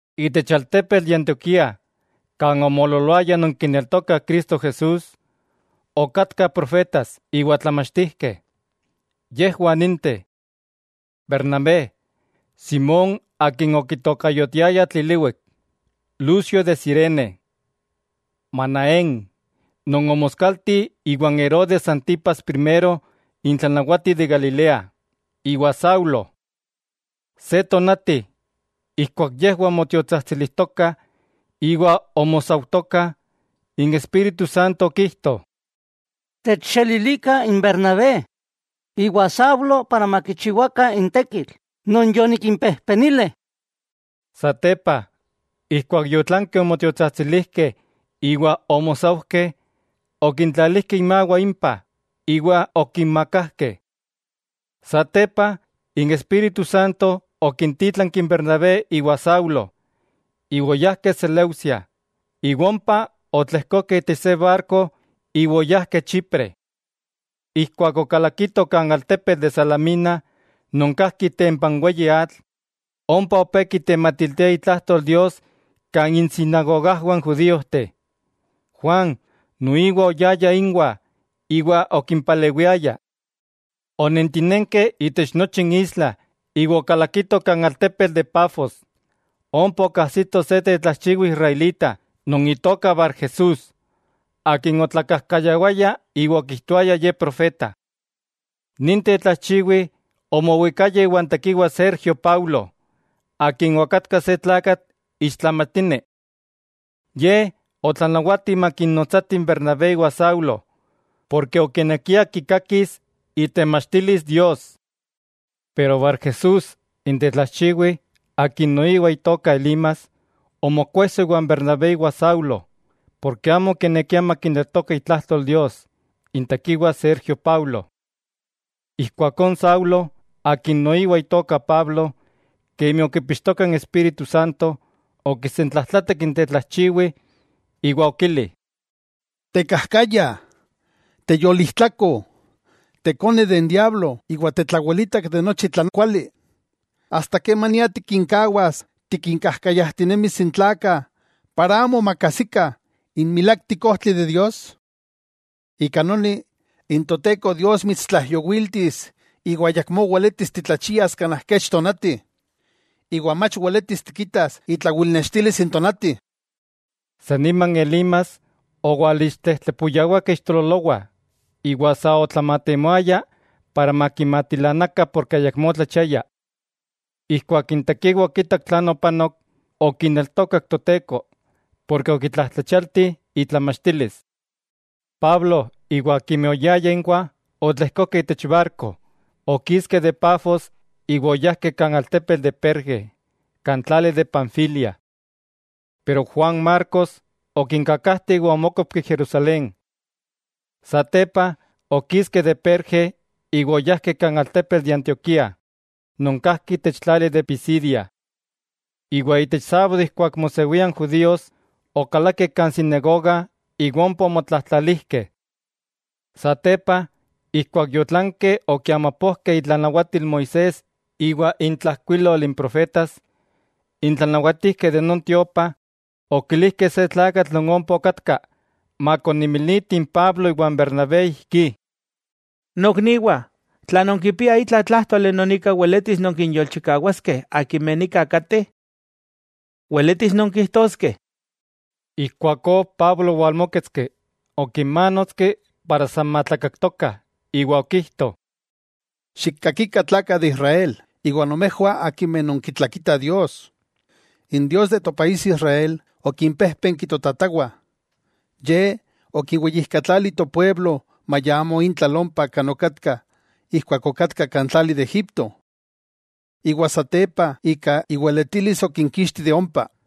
Itech altepetl de Antioquía kan omoololoayah non kineltokah Cristo Jesús, okatkah profetas iwa tlamachtijkeh. Yejwah ninteh: Bernabé, Simón akin okitokayotiayah Tliliwik, Lucio de Cirene, Manaén, non omoskalti iwan Herodes Antipas Primero n tlanawati de Galilea, iwa Saulo. Se tonati, ijkuak yejwah omotiotsajtsilijtokah iwa omosaujtokah, n Espíritu Santo okijto: —Techxelilikah n Bernabé iwa Saulo para makichiwakah n tekitl non yonikimpejpenili. Satepa, ijkuak yotlankeh omotiotsajtsilijkeh iwa omosaujkeh, okintlalijkeh inmawah impah, iwa okinmakajkeh. Satepa, n Espíritu Santo okintítlanki n Bernabé iwa Saulo, iwa oyajkeh Seleucia, iwa ompa otlejkokeh itech se barko iwa oyajkeh Chipre. Ijkuak okalakitoh kan altepetl de Salamina non kajki itempa n weyi atl, ompa opé kitematiltiah itlajtol Dios kan insinagogajwah n judíojteh. Juan noiwa oyaya inwah iwa okimpalewiaya. Onentinenkeh itech nochi n isla iwa okalakitoh kan altepetl de Pafos, ompa okajsitoh se tetlajchiwi israelita non itoka Barjesús akin otlakajkayawaya iwa okijtoaya ye profeta. Nin tetlajchiwi omowikaya iwan tekiwa Sergio Paulo, akin okatka se tlakatl ixtlamatini. Ye otlanawati makinnotsatih n Bernabé iwa Saulo, porke okinekia kikakis itemachtilis Dios. Pero Barjesús n tetlajchiwi, akin noiwa itoka Elimas, omokuejso iwan Bernabé iwa Saulo, porke amo okinekia makineltoka itlajtol Dios n tekiwa Sergio Paulo. Ijkuakó n Saulo, akin noiwa itoka Pablo, kemi okipixtoka n Espíritu Santo, okisentlajtlatak n tetlajchiwi iwa okili: —¡Tekajkaya, teyolijtlako! ¡Ikone n diablo iwa tetlawelitak de nochi tlan kuali! ¿Asta kemania tikinkawas tikinkajkayajtinemis n tlakah para amo makajsikah n milaktik ojtli de Dios? Ika noni, n Toteko Dios mitstlaijyowiltis iwa ayakmó weletis titlachias kanaj kech tonati, iwa mach weletis tikitas itlawilnextilis n tonati. San nima n Elimas owalixtlejtlepuyawakeh ixtololowah, iwa sa otlamatemoaya para makimatilanakah ken ayakmó otlachiaya. Ijkuak n tekiwa okitak tlan opanok, okineltokak Toteko, porke okitlajtlachialti itlamachtilis. Pablo iwa akimeh oyayah inwah otlejkokeh itech barko, okiskeh de Pafos iwa oyajkeh kan altepetl de Perge kan tlali de Panfilia. Pero Juan Marcos okinkakajte iwa omókopki Jerusalén. Satepa okiskeh de Perge iwa oyajkeh kan altepetl de Antioquía, non kajki itech tlali de Pisidia. Iwa itech sábado ijkuak mosewia n judíos, okalakeh kan sinagoga iwa ompa omotlajtlalijkeh. Satepa, ijkuak yotlankeh okiamapojkeh itlanawatil Moisés iwa intlajkuilol n profetas, n tlanawatijkeh de non tiopa, okilijkeh se tlakatl non ompa okatka makoninmiliti n Pablo iwa Bernabé ijkí: —Nokniwah, tla nonkipiah itla tlájtoli non ika weletis nonkinyolchikawaskeh akimeh nika kateh, weletis nonkijtoskeh. Ijkuakó Pablo owalmóketski, okinmánotski para san matlakaktokah, iwa okijto: —Xikkakikah tlakah de Israel, iwa nomejwah akimeh nonkitlakitah Dios: N Dios de Israel okimpéjpenki totatawah. Ye okiweyijkatlali topueblo maya amo intlal ompa kan okatkah ijkuak okatkah kan tlali de Egipto. Iwa satepa ika iweletilis okinkixti de ompa.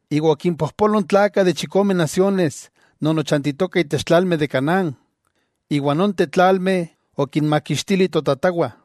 iwa okimpojpolo n tlakah de chikome nasiones non ochantitokah itech tlalmeh de Canaán, iwa nonteh tlalmeh okinmaxkatili totatawah.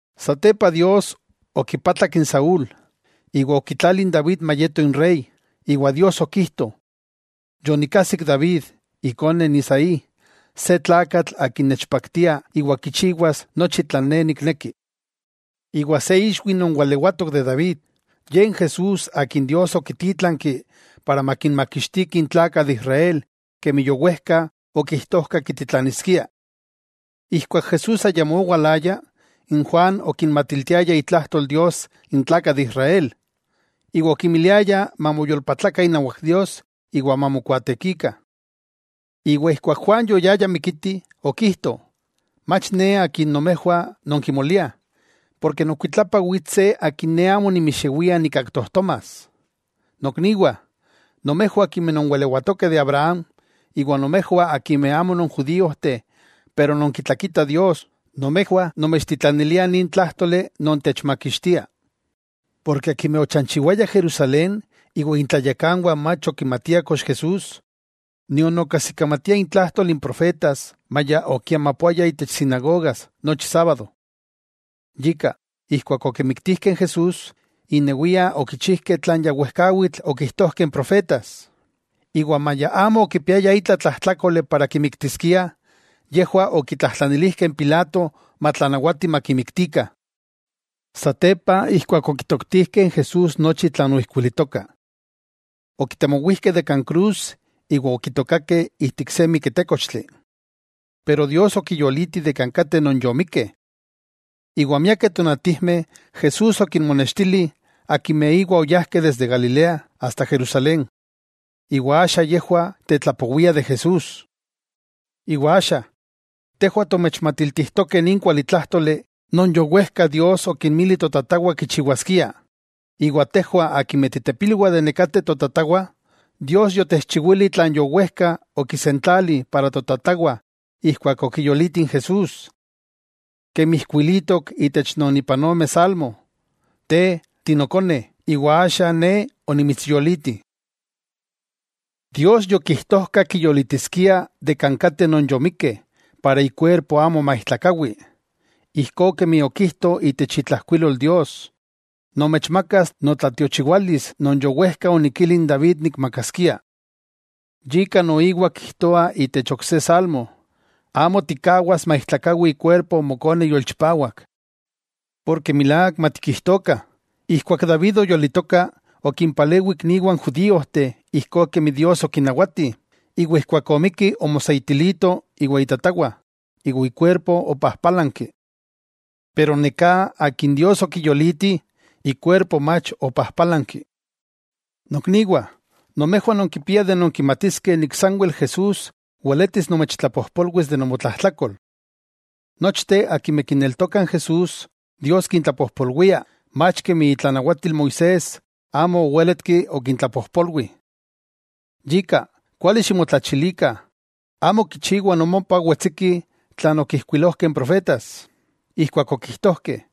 Satepa, Dios okipatlak n Saúl, iwa okitlali n David mayeto inrey, iwa Dios okijto: “Yonikajsik David, ikone n Isaí, se tlakatl akin nechpaktia iwa kichiwas nochi tlan Ne nikneki.” Iwa se ixwi non walewatok de David, Ye n Jesús Akin Dios okitítlanki para makinmakixtiki n tlakah de Israel kemi yowejka okijtojka kititlaniskia. Ijkuak Jesús ayamó owalaya, n Juan okinmatiltiaya itlajtol Dios n tlakah de Israel, iwa okimiliaya mamoyolpatlakah inawak Dios iwa mamokuaatekikah. Iwa ijkuak Juan yoyaya mikiti, okijto: “Mach ne akin nomejwah non kimoliah, porke nokuitlapa wits se akin ne amo nimixewia nikaktojtomas.” 'Nokniwah, nomejwah akimeh nonwalewatokeh de Abraham, iwa nomejwah akimeh amo non judíojteh pero nonkitlakitah Dios: nomejwah nomechtitlaniliah nin tlájtoli non techmakixtia. Porke akimeh ochanchiwayah Jerusalén iwa intlayakanwah mach okimatiah kox Jesús, nion okajsikamatiah intlajtol n profetas maya okiamapoaya itech sinagogas nochi sábado. Yika, ijkuak okimiktijkeh n Jesús, innewiah okichijkeh tlan ya wejkawitl okijtojkeh n profetas. Iwa maya amo okipiaya itla tlajtlákoli para kimiktiskiah, yejwah okitlajtlanilijkeh n Pilato matlanawati makimiktikah. Satepa ijkuak okitoktijkeh n Jesús nochi tlan oijkuilitokah. Okitemowijkeh de kan krus iwa okitookakeh ijtik se miketékochtli. Pero Dios okiyoliti de kan kateh non yomikkeh. Iwa miakeh tonatijmeh Jesús okinmonextili akimeh iwa oyajkeh desde Galilea asta Jerusalén. Iwa axa yejwah tetlapowiah de Jesús. 'Iwa axa, tejwah tomechmatiltijtokeh nin kualitlájtoli non yowejka Dios okinmili totatawah kichiwaskiah. Iwa tejwah ken ipilwah totatawah, Dios yotechchiwili tlan yowejka okinsentlalili totatawah ijkuak okiyoliti n Jesús. Kemi ijkuilitok itech non ipan ome Salmo: “Te tinokone; iwa axa Ne onimitsyoliti.” Dios yokijtojka kiyolitiskia de kan kateh non yomikkeh para ikuerpo amo maijtlakawi, ijkó kemi okijto itech itlajkuilol Dios: “Nomechmakas notlatiochiwalis non yowejka onikili n David nikmakaskia.” Yika noiwa kijtoa itech ok se Salmo: “Amo tikkawas maijtlakawi ikuerpo Mokone yolchipawak.” Porke milák matikijtokah, ijkuak David oyolitoka, okimpalewi ikniwah n judíojteh ijkó kemi Dios okinawati, iwa ijkuak omikki omoseitilito iwa itatawah, iwa ikuerpo opajpálanki. Pero neká akin Dios okiyoliti, ikuerpo mach opajpálanki. Nokniwah, nomejwah nonkipiah nonkimatiskeh sanwel Jesús weletis nomechtlapojpolwis de nomotlajtlakol. Nochteh akimeh kineltokah n Jesús, Dios kintlapojpolwia, mach kemi itlanawatil Moisés amo owéletki okintlapojpolwi. Yika, kuali ximotlachilikah, amo kichiwa nomopah wetsiki tlan okijkuilojkeh n profetas, ijkuak okijtojkeh: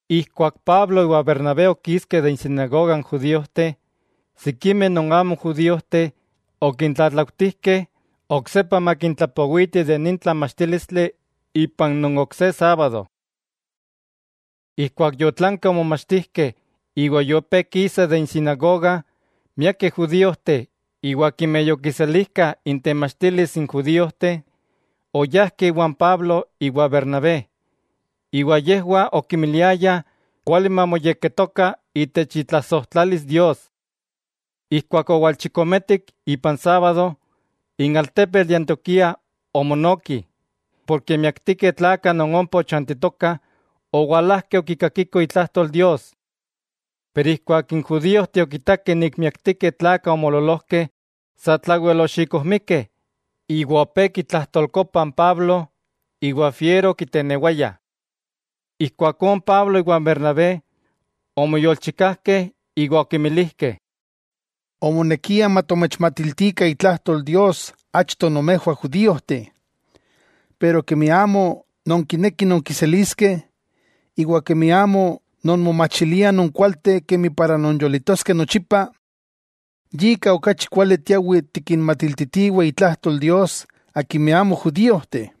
Ijkuak Pablo iwa Bernabé okiskeh de insinagoga n judíojteh, sikimeh non amo judíojteh okintlatlaujtijkeh oksepa makintlapowiti de nin tlamachtílistli itech non ok se sábado. Ijkuak yotlankeh omomachtijkeh iwa yopé kisah de insinagoga, miakeh judíojteh iwa akimeh yokiselijkah intemachtilis n judíojteh, oyajkeh iwan Pablo iwa Bernabé. Iwa yejwah okimiliayah kuali mamoyekketokah itech itlasojtlalis Dios. Ijkuak owalchikometik, ipan sábado, n altepetl de Antioquía omonoki, porke miaktikeh tlakah non ompa ochantitokah owalajkeh okikakikoh itlajtol Dios. Pero ijkuak n judíojteh okitakeh miaktikeh n tlakah omoololojkeh, satlawel oxikojmikeh iwa opé kitlajtolkopah n Pablo iwa fiero okitenewayah. Ijkuakó n Pablo iwan Bernabé, omoyolchikajkeh iwa okimilijkeh: —Omonekia matomechmatiltikah itlajtol Dios achto nomejwah judíojteh. Pero kemi amo nonkinekih nonkiseliskeh, iwa kemi amo nonmomachiliah nonkualteh kemi para nonyolitoskeh nochipa, yika okachi kuali tiawih tikinmatiltitiweh itlajtol Dios akimeh amo judíojteh.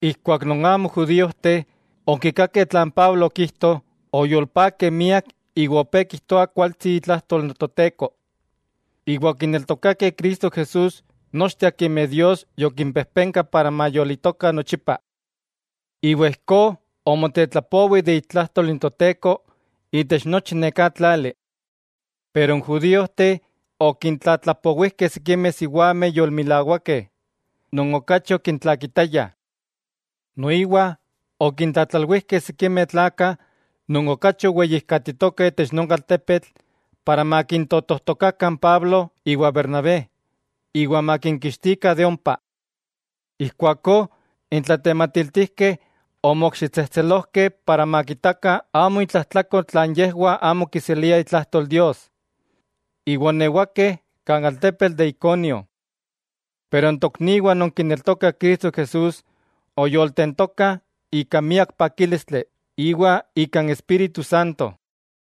Ijkuak non amo judíojteh, okikakeh tlan Pablo okijto, oyolpakeh miak iwa opé kijtoah kualtsi itlajtol n Toteko. Iwa okineltokakeh Cristo Jesús nochteh akimeh Dios yokimpejpenka para mayolitokah nochipa. Iwa ijkó omotetlapowi itlajtol n Toteko itech nochi neká tlali. Pero n judíojteh okintlatlapowijkeh sikimeh siwameh yolmilawakeh non okachi okintlakitayah. Noiwa okintlatlalwijkeh sikimeh tlakah non okachi oweyijkatitokah itech non altepetl para makintotojtokakah n Pablo iwa Bernabé iwa makinkixtikah de ompa. Ijkuakó n tlatematiltijkeh omokxitsejtselojkeh para makitakah amo intlajtlakol tla yejwah amo kiseliah itlajtol Dios, iwa oonewakeh kan altepetl de Iconio. Pero n tokniwah non kineltokah Cristo Jesús oyoltentokah ika miak pakílistli iwa ika n Espíritu Santo.